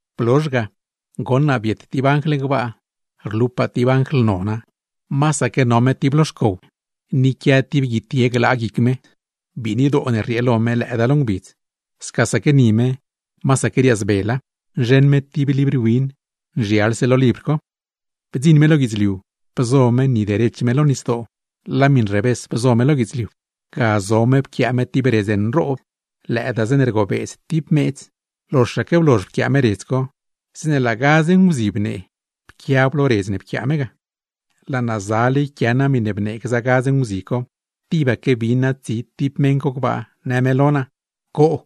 Blozh ga, goṉ naa biet tib anjl gbaa, rlupaa tib anjl nona, masaque no me tib lo xcow, ni quia tib guitye glaa guic me. Biinidoo ne rriee lo me, lëëdaa lo ngbidz; scasaque ni me, masaque riaazbela. Nzheṉ me tib libr win, nzhialse lo libr co. Bdziṉ me lo guidzliu, bzo me ni derech me lo nisdoo, laa miṉ revés bzo me lo guidzliu. Ga zo me pquiaa me tib redz nroob, lëëdaa zeeṉe rgobeedz tib meedz; loxaque blozh pquiaa me redz co, zeeṉe laa gadz nguzi bnee, pquiab lo redz ne pquiaa me ga. Laa naa zale yquia naa miṉe bnee gza nguzi co, tibaque bin naa tsi tib meṉ co gbaa, në me lo naa: ―¡Coo,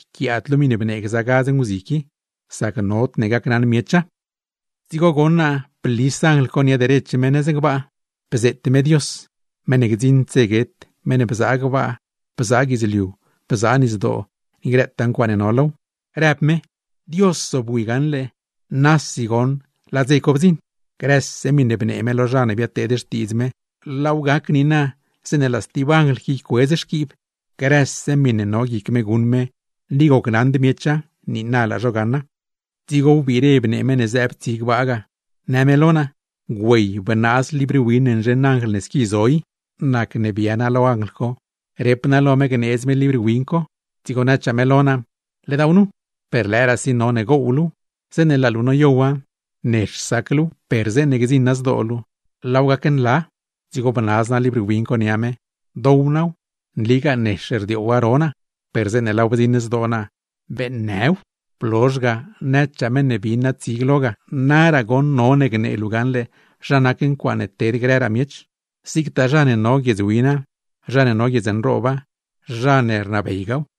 yquiaad luu miṉe bnee gza nguzi qui! Sac nodne gacnaṉ miecha. Dzigo goṉ naa blis anjl co nia derech me nëz gbaa, bzeet me Dios (meṉ ne gdziṉd dze guet, meṉ ne bzaa gbaa, bzaa guidzliu, bzaa nisdoo, ni grëtaa ncuaaṉe no low), rëb me: ―Dios zobwi gaṉle, nasi goṉ laa dze co bdziṉ. Grëse miṉe bnee me lo zha ne biadteed xtiidz me, laaw gac niina zeeṉe laa stib anjl qui ycuedz xquiib zho. Grëse miṉe no guic me guṉ me ni gocnaṉd miecha, niina laa zho gaṉa. Dzigo wbiire bnee meṉ ne zëëb tsi gbaa ga, në me lo naa: ―Güey, bnaaz libr win ne nzheṉ anjl ne squi zo i. Nacne bia naa lo anjl co, rep naa lo me gneedz me libr win co, dzigo nëchaa me lo naa: ―Ledaaw nu, per lëëraasi none gow luuw. Zeeṉe laa luu noyowa, nex sac luuw; per zeeṉe gdziṉa zdoo luu, laaw gacnla. Dzigo bnaz naa libr win co nia me, dow naaw. Nligaa nex rdioowa now ro naa, per zeeṉe laaw bdziṉ zdoo naa, beeṉnëw. Blozh ga, nëchaa meṉ ne bin naa tsi glo ga: ―Naraa goṉ none gnee luu gaṉle zha nac ncuaaṉe ted grëraa miech, zigtaa zha ne no guiedz wina, zha ne no guiedz nrooba, zha ne rnabeygaaw.